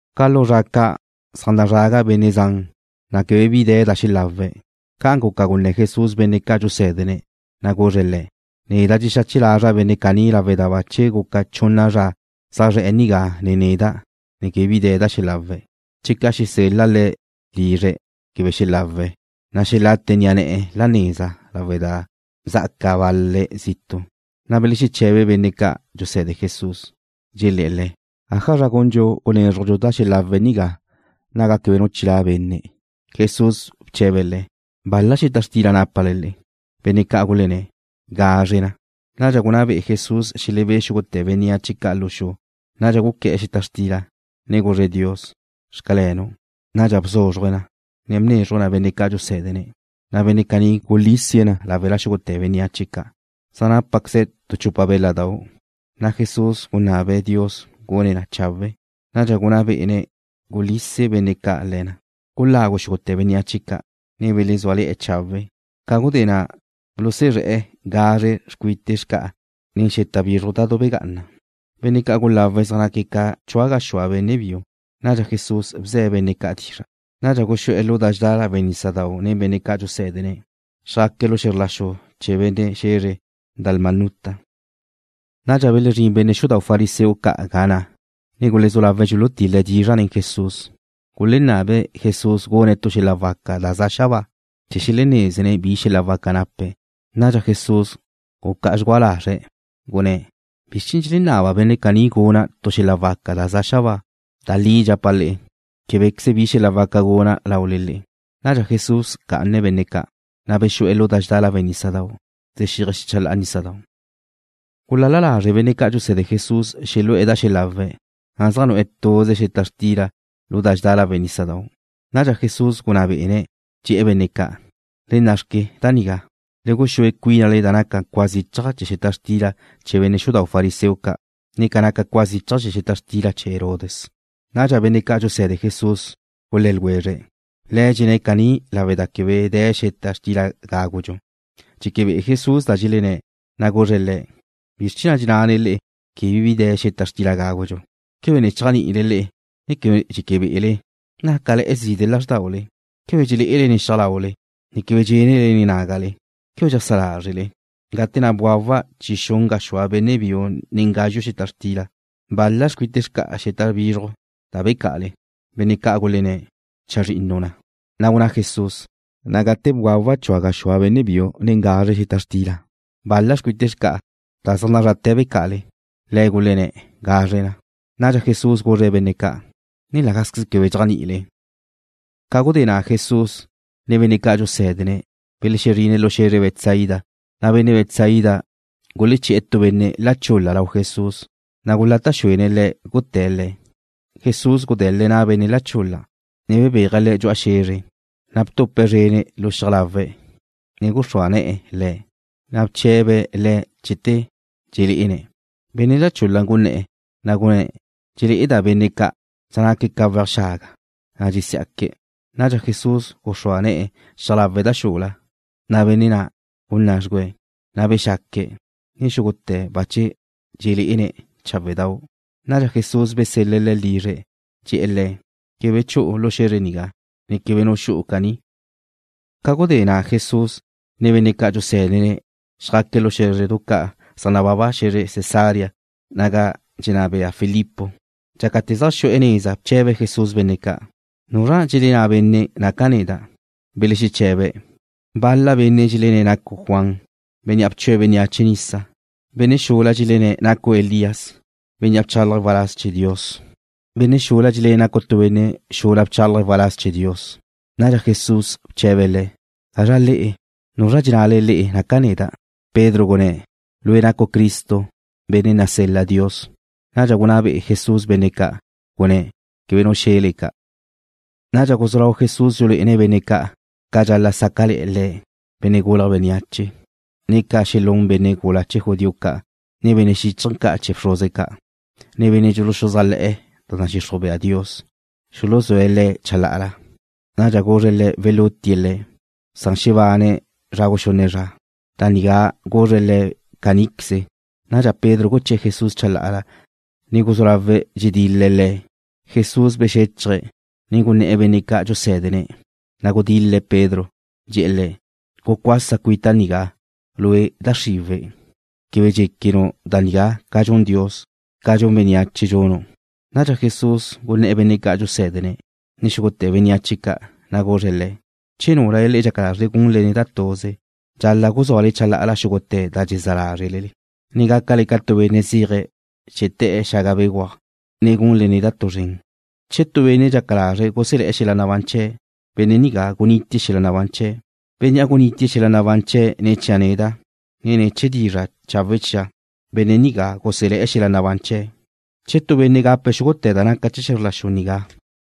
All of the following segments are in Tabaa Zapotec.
Ca lu zra ca' zaj nazraga benne' zan, na' quebe bi de̱ da xelawe̱'. Ca'an guca gunné̱ Jesús benne' ca' dxusé̱dene̱', na' guzre̱' le̱': ―Neda' dxexache lazra' benne' caní lawe' da bache guca chunna zra zaj zre̱'e̱ nigá nen neda', ne quebe bi de̱ da xelawe̱'. Che ca' xesel-la' le̱' lizre̱' quebe xelawe̱', na' xelate ni'a ne̱'e̱ la neza lawe' da zá'aca bal-le̱' zitu'. Na' belexeche̱be benne' ca' dxuse̱de Jesús, dxelé̱'e̱ Le̱': ―¿Ájazra gundxu gunézrujdxu da xelawe̱' nigá, ga quebe nu chilá' benne'? Jesús bche̱be̱' le̱': ―¿Bal-la xeta xtila nápale le'e? Benne' ca' gulenné̱': ―Gazre na. Nadxa gunná be'e Jesús xelebé' xúgute̱ bénneache ca' lu xu. Nadxa guqué̱'e̱ xeta xtila, ne guzre̱' Dios: ―Xcalenu'. Nadxa bzúzruje̱' na, ne bnézruje̱' na benne' ca' dxusé̱dene̱', na' benne' caní gulísie̱' na láwela xúgute̱ bénneache ca'. Zaj nápaqueze̱' tu chupa béladau'. Na' Jesús gunabe̱' Dios gune̱' na chawe'. Nadxa gunná bé'ene̱' gulise benne' ca' le̱ na. Gulagu xúgute̱ bénneache ca', ne belezúale̱'e̱ chawe'. Ca gudé na' bulusuzré̱'e̱ gazre xcuite xca'a nen xeta bizruj da belegá'ana. Benne' ca' gulawe̱' zaj naque̱' ca chua gaxúa benne' biu. Nadxa Jesús bze̱' benne' ca' dizra'. Nadxa guxú'e̱ lu da dxedá lawe' nísadau' nen benne' ca' dxusé̱dene̱'. Xjaque̱' lu xe̱zr la xu chee̱ benne' xe̱zre Dalmanuta. Nadxa belezrín benne' xudau' fariseo ca' ga na', ne gulezú lawe̱' dxulutil-le̱' dizra' nen Jesús. Gulenabe̱' Jesús gune̱' tu xel-la waca da za xabáa, chee̱ xelenézene̱' bi xel-la waca nape̱'. Nadxa Jesús gucá'a dxgua lazre̱', gunné̱': ―¿Bizr chee̱ na' dxelenaba benne' caní guna' tu xel-la' waca da za xabáa? Da li dxapa' le'e, québequeze bi xel-la waca guna' lau le'e. Nadxa Jesús bca'ane̱' benne' ca', na' bexu'e̱ lu da dxedá lawe' nísadau', dxexíaje̱' xechelá'a chee̱ nísadau'. Gulal-la lazre' benne' ca' dxuse̱de Jesús xelu'e̱ da xelawe̱', na' zaj nu'e̱ tuze xeta xtila lu da dxedá lawe' nísadau'. Nadxa Jesús gunná bé'ene̱', dxe̱'e̱ benne' ca': ―¡Le nna'xque nigá! Le guxúe cuínale da naca cua zichaj chee̱ xeta xtila chee̱ benne' xudau' fariseo ca', ne ca naca cua zichaj chee̱ xeta xtila chee̱ Herodes. Nadxa benne' ca' dxuse̱de Jesús gulé̱ ljwezre̱': ―Le̱' dxenné̱' caní lawe' da quebe de̱ xeta xtila gágudxu. Dxeque be'e Jesús da dxelenné̱', na' guzre̱' le̱': ―¿Bizr chee̱ na' dxennale quebe de̱ xeta xtila gágudxu? ¿Quebe ne chéajni'ile ne quebe dxeque be'ele? ¿Nácale̱'e̱ zide' lázrdaule? ¿Quebe dxelé'ele nen xiaj laule, ne quebe dxenle nen nágale? ¿Quebe dxeajsá lázrele? Gate na' bgawa' chi xun gaxúa benne' biu nen gazxu' xeta xtila, ¿bal-la xcuite xca'a xeta bizruj da becá'ale? Benne' ca' gulenné̱': ―Chazrinnu na. Na' gunná Jesús: ―Na' gate na' bgawa' chua gaxúa benne' biu nen gazre xeta xtila, ¿bal-la xcuite xca'a da zaj zrate̱ becá'ale? Le̱' gulenné̱': ―Gazre na. Nadxa Jesús guzre̱' benne' ca': ―¿Ne la gázqueze quebe dxéajni'ile? Ca gudé na' Jesús, ne benne' ca' dxusé̱dene̱' belexezrine̱' lu xe̱zre Betsaida, na' benne' Betsaida guleché̱'e̱ tu benne' la chul-la lau Jesús, na' gulata' xuene̱' Le̱' guté̱' le̱'. Jesús gudele̱' na' benne' la chul-la, ne bebéaje̱' le̱' dxu'a xe̱zre. Na' btupe̱' zrene̱' lu xiaj lawe̱', ne guxrúa ne̱'e̱ le̱'. Na' bche̱be̱' le̱' chete dxelé'ene̱'. Benne' la chul-la gunné̱'e̱, na' gunné̱': ―Dxelé'eda' benne' ca', zaj naque̱' ca weaj xaga, na' dxesí'aque̱'. Nadxa Jesús guxrúa ne̱'e̱ xiaj lawe̱' da xula, na' benne' na' gunná' dxgüe̱'. Na' bexaque̱', ne xúgute̱ bache dxelé'ene̱' cháwedau'. Nadxa Jesús besel-le̱' le̱' lizre̱', dxe̱'e̱ le̱': ―Quebe chu'u lu xe̱zre nigá, ne quebe nu xu'u caní. Ca gudé na' Jesús, ne benne' ca' dxusé̱dene̱' xjaque̱' lu xé̱zredu ca' zaj nababa xe̱zre Cesarea naga dxenná bea Filipo. Dxácate̱ zaj xu'e̱ neza bche̱be Jesús benne' ca': ―¿Nuzra na' dxelenná benne' naca' neda'? Belexeche̱be̱': ―Bal-la benne' dxelenné̱' nacu' Juan, bénnea' bchue̱' bénneache nisa. Benne' xula dxelenné̱' nacu' Elías, bénnea' bchálaje̱' waláz chee̱ Dios. Benne' xula dxelenné̱' nacu' tu benne' xula bchálaje̱' waláz chee̱ Dios. Nadxa Jesús bche̱be̱' le̱': ―¿Gazra le'e? ¿Nuzra dxennale le'e naca' neda'? Pedro gunné̱': ―Lue' nacu' Cristo, benne' nasel-la Dios. Nadxa gunná be'e Jesús benne' ca'. Gunné̱': ―Quebe nu xe̱le ca'. Nadxa guzú lau Jesús dxulé'ene̱' benne' ca' ca dxal-la' sáca'le̱'e̱ Le̱', Benne' Gulje̱' Bénneache, ne ca xelún benne' gula chee̱ judío ca', ne benne' xíchaje̱ ca' chee̱ bxruze ca', ne benne' dxuluxuzájle̱'e̱ da nadxixruj bea Dios, xuluzúe̱' Le̱' chalá'ala. Nadxa guzre̱' le̱' welútie̱' Le̱', san xebane̱' zra guxunne zra. Da nigá guzre̱' le̱' caníqueze. Nadxa Pedro guché̱'e̱ Jesús chalá'ala, ne guzú lawe̱' dxedil-le̱' Le̱'. Jesús bexéchaje̱', ne gunné̱'e̱ benne' ca' dxusé̱dene̱', na' gudil-le̱' Pedro, dxe̱'e̱ le̱': ―Gucuasa cuita' nigá, lue', da xriwe̱'. Quebe dxéquenu' da nigá ca dxun Dios. Ca dxun bénneache dxunu'. Nadxa Jesús gunné̱' benne' ca' dxusé̱dene̱', ne xúgute̱ bénneache ca', na' guzre̱' le̱': ―Che núlale dxaca lázrele gunle neda' tuze, dxal-la' guzúale chalá'ala xúgute̱ da dxezá lázrele le'e, ne gácale ca tu benne' zéaje̱' chee̱ te̱'e̱ xaga béguaj, na' gunle neda' tu zren. Che tu benne' dxaca lazre̱' guselé̱' xel-la nabán chee̱', benne' nigá gunitie̱' xel-la nabán chee̱'. Bénnea' gunitie̱' xel-la nabán chee̱' ne̱ chia' neda', ne ne̱ chee̱ dizra' chawe' chia', benne' nigá guselé̱' xel-la nabán chee̱'. Che tu benne' gape̱' xúgute̱ da naca chee̱ xe̱zr la xu nigá,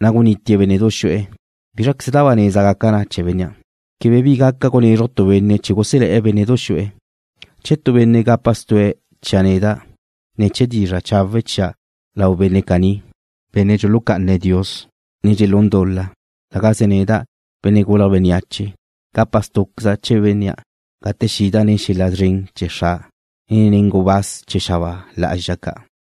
na' gunitie̱' bénne'du xu'e̱, ¿bízraqueze da ba neza gaca na chee̱ bénnea'? Quebe bi gaca gunezruj tu benne' chee̱ guselé̱' bénne'du xu'e̱. Che tu benne' gapa stu'e̱ chia' neda', ne chee̱ dizra' chawe' chia' lau bénne' caní, benne' dxulucá'ana Dios, ne dxelún dul-la, la gaze neda', Benne' Gulje̱' Bénneache, gapa stú'queza' chee̱ bénnea' gate xida' nen xel-la szren chee̱ Xra', ne nen gubáz chee̱ xabáa lá'azxa ca'.